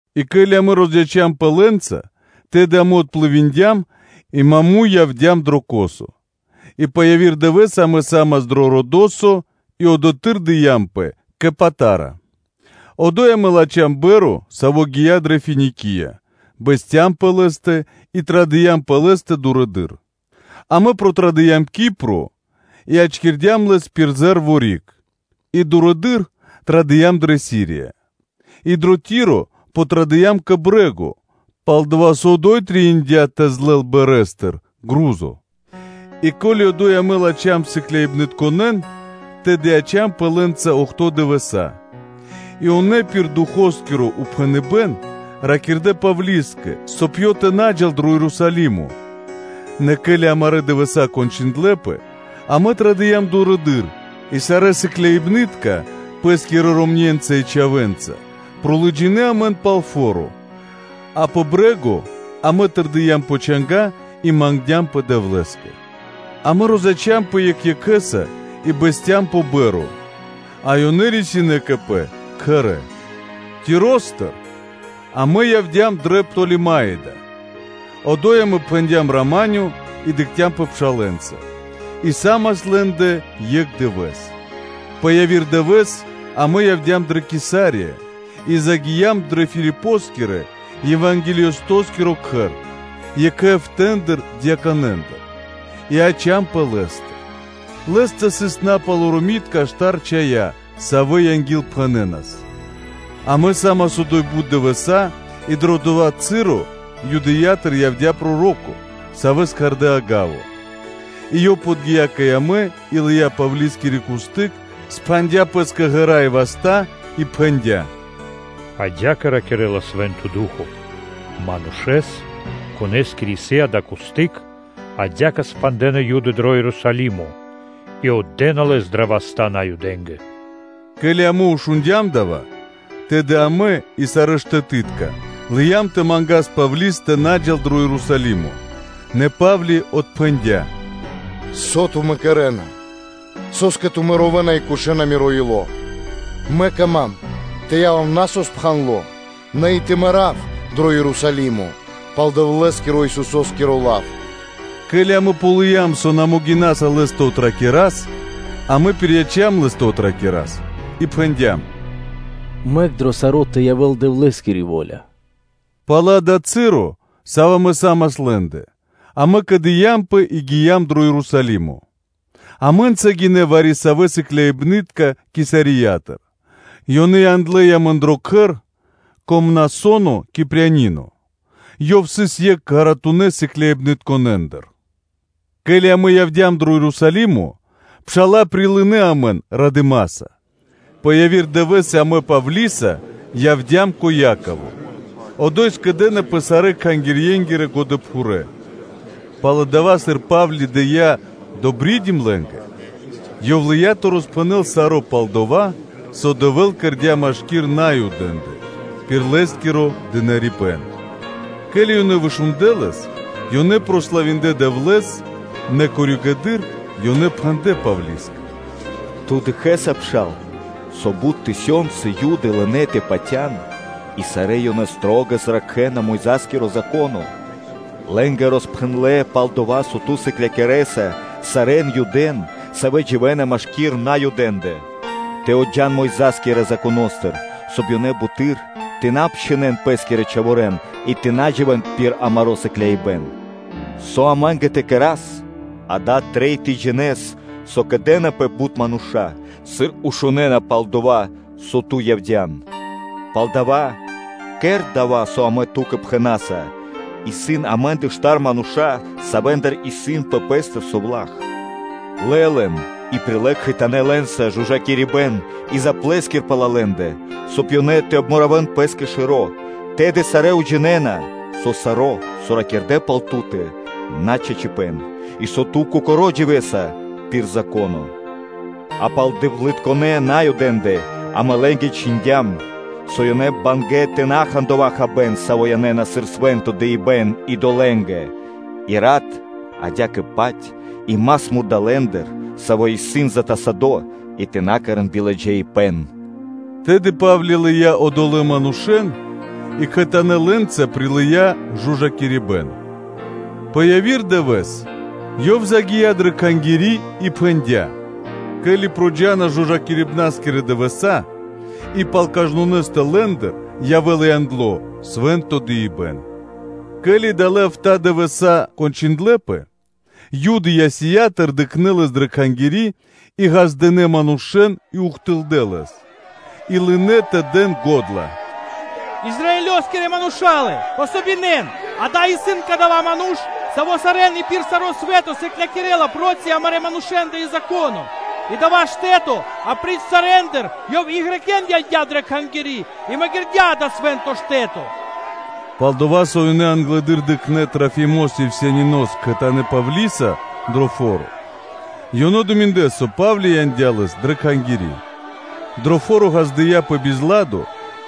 И ке́ли амэ розяцямпэ лэ́нца, тэды амэ отплывиндям (дыя́м пли́ма кри́г) и маму́й явдя́м дро Косо, и пэ яви́р дывэ́с амэ са́мас кэ Родосо, и одотхы́р дыямпэ кэ Патара. Одо́й амэ латхям па́рма (кораблё), сави́ гия́ дрэ Финикия, бэсцям пэ ла́тэ и традыям пэ ла́тэ дурэды́р. Амэ протрадыям (накхця́м) Кипро, и ячкирдям ла пир зэ́рво (ле́во) риг, и дурэды́р традыям дрэ Сирия и дрэ Ти́ро подтрадыям кэ брэ́го, пал-дова́ со ада́й трэиндя́ тэ злэл парма́тыр пхарипэ́н (грузо). И ке́ли одо́й амэ латхям сыкляибнытконэ́н, тэды яцямпэ лэ́нца охто́ (бидуе́нгиро дэш) дывэса́, а ёнэ, пир Духоскиро упхэныбэ́н, ракирдэ́ Павлискэ, соб (кай) ёв тэ на джал дро Ерусалимо. Нэ ке́ли амарэ́ дывэса́ кончындлэпэ, амэ традыям дурэды́р, и сарэ́ сыкляибны́тка пэ́скирэ ромне́нца и чхавэ́нца лыджинэ́ амэн пал фо́ро. А пэ брэ́го амэ тэрдиям пэ чанга́ и мангдямпэ Дэвлэ́скэ. Амэ розяцямпэ екх екхэ́са и бэсцям пэ па́рма, а ёнэ рисинэ́ кэ пэ кхэрэ́. Тиростыр амэ явдя́м дрэ Птолемаида, одо́й амэ пхэндям “рама́нё” (миро) и дыкхцямпэ пшалэ́нца и са́мас лэ́ндэ екх дывэ́с. Пэ яви́р дывэ́с амэ явдя́м дрэ Кесария, и загиям дрэ Филипоскирэ – евангелистоскиро кхэр, екхэ эфта́ дьяконэндыр, и яцямпэ лэ́стэ. Лэ́стэ сыс напалоромитка патывалэ́ штар чхая́, савэ́ ангилпхэнэнас. Амэ одо́й са́мас бут дывэса́, и дрэ дова́ часо Юдэя́тыр явдя́ проро́ко, савэ́с кхардэ́ Агаво, и ёв подги́я кэ амэ и лыя́ Павлискири кусты́к, пхандя пэ́скэ ґэра́ и васта́ и пхэндя́: “Адя́кэ ракирэ́ла Свэ́нто Ду́хо (Фа́но)”, – манушэ́с, конэ́скири исын дая́ кусты́к, адя́кэ пхандэна Юды лэс дро Ерусалимо и отдэна лэс дрэ васта́ Наюдэ́нгэ.” Ке́ли амэ шундя́м дава́, тэды амэ, и сарэ́ штэтытка, лыям тэ мангас Павли́с тэ на джал дро Ерусалимо. Нэ Па́вли отпхэндя́: “Со тумэ́ кэрэ́на? Со́скэ тумэ́ ровэна и кушэна миро ило́? Мэ кама́м тэ явав на со пхандло, нэ и тэ мэрав дро Ерусалимо пал Дэвлэ́скирэ-Исусо́скиро лав. Ке́ли амэ ґалыям, со на могинаса лэс тэ отракирас, амэ пирияцям лэс тэ отракирас и пхэндям: “Мэк дро саро́ тэ явэ́л Дэвлэ́скири во́ля.” Пало́ дава́ часо, саво́ амэ са́мас лэ́ндэ, амэ кэдыямпэ и гиям дро Ерусалимо. Амэ́нца гинэ́ вари-савэ́ сыкляибны́тка Кесариятыр, ёнэ яндлэ́ амэн дро кхэр кэ Мнасоно Кипрянино, ёв сыс екх ґаратунэ́ сыкляибнытконэндыр. Ке́ли амэ явдя́м дрэ Ерусалимо, пша́ла прилынэ́ амэн радыма́са. Пэ яви́р дывэ́с амэ Павлиса явдя́м кэ Яково, одо́й скэдынэ́пэ сарэ́ кхангирьенгирэ годэпхурэ́. Пал дава́, сыр Па́вли дыя́ “добридим” лэ́нгэ, ёв лыя́ тэ роспхэнэл саро́ пал дова́, со Дэвэ́л кэрдя́ машки́р Наюдэ́ндэ пир лэ́скиро дынарибэ́н. Ке́ли ёнэ вышундлэ лэс, ёнэ прославиндлэ Дэвлэ́с, нэ коригэды́р (позжэ) ёнэ пхэндлэ́ Павлискэ: “Ту дыкхэ́са, пша́ла, со бут тысёнцы Юды лынэ́ тэ патя́н, и сарэ́ ёнэ шылалэс ракхэна Мойза́скиро Зако́но; лэ́нгэ роспхэндлэ́ пал дова́, со ту сыклякирэса сарэ́н Юдэ́н, савэ́ дживэ́на машки́р Наюдэ́ндэ, тэ отджан Мойза́скирэ Законо́стыр, соб (кай) ёнэ буты́р тэ на обчхинэн пэ́скирэ чхаворэ́н и тэ на дживэ́н пир амаро́ сыкляибэн. Со амэ́нгэ тэ кэра́с? Дава́ трэй тэ джинэ́с, со кэдэнапэ бут мануша́, сыр шунэ́на пал дова́, со ту явдя́н. Палдава́, кэр дова́, со амэ ту́кэ пхэна́са: исын амэ́ндэ штар мануша́, савэ́ндыр исын пэ пэ́стэ совла́х; лэ лэн, и прилэ́ кхэтанэ́ лэ́нца жужакирибэн и заплэскир пал лэ́ндэ, соб (кай) ёнэ тэ обмуравэн пэ́скэ шэро́, тэды сарэ́ уджинэна, со саро́, со ракирдэ́ пал ту́тэ, на чачипэ́н, и со ту кокоро́ дживэса пир Зако́но. А пал дэвлытконэ́ Наюдэ́ндэ амэ лэ́нгэ чхиндям, со лэ́нгэ сыс нашты́ тэ на хан дова́ хабэ́н, саво́ янэ́на сыр свэ́нто дыибэ́н идолэ́нгэ, и рат, адя́кэ-паць и мас мурдалэ́ндыр, саво́ исын затасадо и тэ на кэрэ́н биладжаипэ́н.” Тэды Па́вли лыя́ одолэ́н манушэ́н и кхэтанэ́ лэ́нца прилыя́ жужакирибэн, нэ пэ яви́р дывэ́с ёв загия́ дрэ Кхангири́ и пхэндя́, ке́ли проджа́на (накхэ́на) жужакирибнаскирэ дывэса́ и пал кажнонэ́стэ лэ́ндыр явэ́ла яндло свэ́нто дыибэ́н. Ке́ли далэ́ эфта́ дывэса́ кончындлэпэ, Юды Асиятыр дыкхнэ́ лэс дрэ Кхангири́, и ґаздынэ́ манушэ́н и ухтылдэ́ лэс, и лынэ́ тэ дэн го́дла: “Израилёскирэ Мурша́лэ! Дэн васт! Дава́ исын кадава́ ману́ш, саво́ сарэ́н и пир саро́ свэ́то сыклякирэ́ла проти амарэ́ манушэ́ндэ, проти Зако́но, и проти дава́ штэ́то; апри́ч саро́ ёв и Грекэ́н (Баламэ́н) яндя́ дрэ Кхангири́ и магирдя дава́ свэ́нто штэ́то.” Пал-дова́ со ёнэ англэды́р дыкхнэ́ Трафимос Ефесянинос кхэтанэ́ Павлиса дрэ фо́ро: ёнэ думиндлэ, со Па́вли яндя́ лэс дрэ Кхангири́. Дрэ фо́ро ґаздыя́пэ бизладо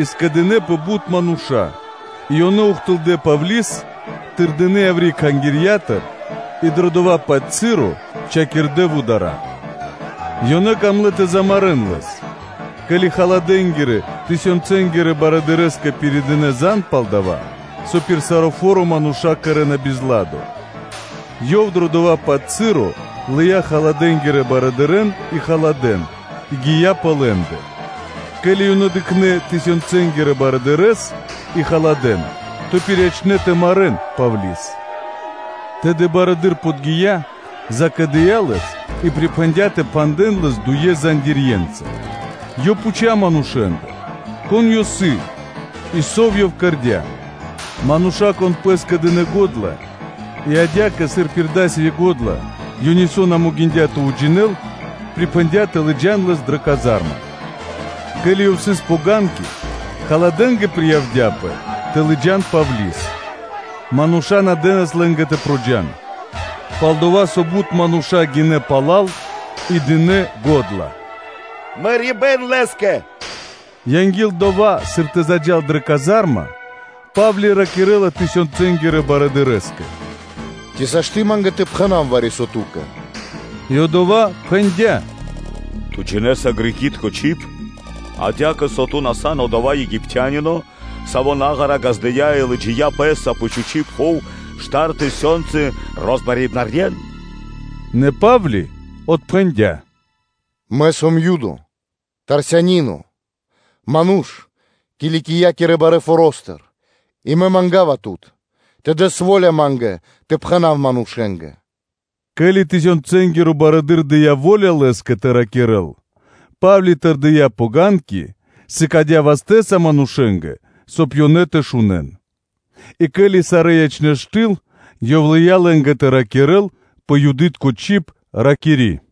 и скэдынэ́пэ бут мануша́; и ёнэ ухтылдэ́ Павли́с, тырдынэ яври́ Кхангирья́тыр, и дрэ дова́-паць часо чхакирдэ вудара́. Ёнэ камлэ́ тэ замарэ́н лэс, ке́ли халадэ́нгирэ – тысёнцэнгирэ барыдырэ́скэ пиридынэ зан (звесь) пал дова́, со пир саро́ фо́ро мануша́ кэрэ́на бизладо. Ёв дро дова́-паць часо, лыя́ халадэнгирэн барыдырэ́н и халадэ́н и гия́ пэ лэ́ндэ. Ке́ли ёнэ дыкхнэ́ тысёнцэнгирэ барыдырэ́с и халадэ́н, то пириячнэ тэ марэ́н Павли́с. Тэды барыдыро́ подги́я, закэдыя лэс и припхэндя́ тэ пхандэн лэс дуе зандирьенца, ёв пхуця́ манушэ́ндыр, кон ёв сыс и со ёв кэрдя́? Мануша́, кон пэ́скэ дынэ́ го́дла, и адя́кэ, сыр пир дасави́ го́дла, ёв нисо́ на могиндя́ тэ уджинэл, припхэндя́ тэ лыджа́н лэс дрэ казарма. Ке́ли ёв сыс пэ ΄гэруня (ступеньки), халадэнгэ приявдяпэ тэ лыджа́н Павли́с, мануша́ на дэ́нас лэ́нгэ тэ проджан. Пал-дова́ со бут мануша́ гинэ́ пала́л, и дынэ́ го́дла: “Мэрибэ́н лэ́скэ!” Анги́л дова́, сыр тэ заджа́л дрэ тва́рдыма (диз), Па́вли ракирэ́ла тысёнцэнгирэ барыдырэ́скэ: “Ци сашты́ (можна) ма́нгэ тэ пхэна́в вари-со ту́кэ?” И одова́ пхэндя́: “Ту джинэ́са Греки́тко (Балами́тко) чиб?” Адя́кэ, со ту на сан одова́ Египтянино, саво́ наґара газдыя и лыджия́ пэ́са пэ чхучи́ пхув штар тысёнцы розмарибнарьен?” Нэ Па́вли отпхэндя́: “Мэ сом Юдо, Тарсянино, ману́ш Киликиякирэ барэ́ форо́стыр; и мэ манга́ва тут тэ дэс во́ля ма́нгэ тэ пхэна́в манушэ́нгэ.” Ке́ли тысёнцэнгиро барыдыро́ дыя́ во́ля лэ́скэ тэ ракирэ́л, Па́вли тэрдия́ пэ стылба (лесвица), сыкадя́ вастэ́са манушэ́нгэ, соб (кай) ёнэ тэ шунэ́н; и, ке́ли сарэ́ ячнэ́ штыл, ёв лыя́ лэ́нгэ тэ ракирэ́л пэ Юды́тко чиб, ракири́: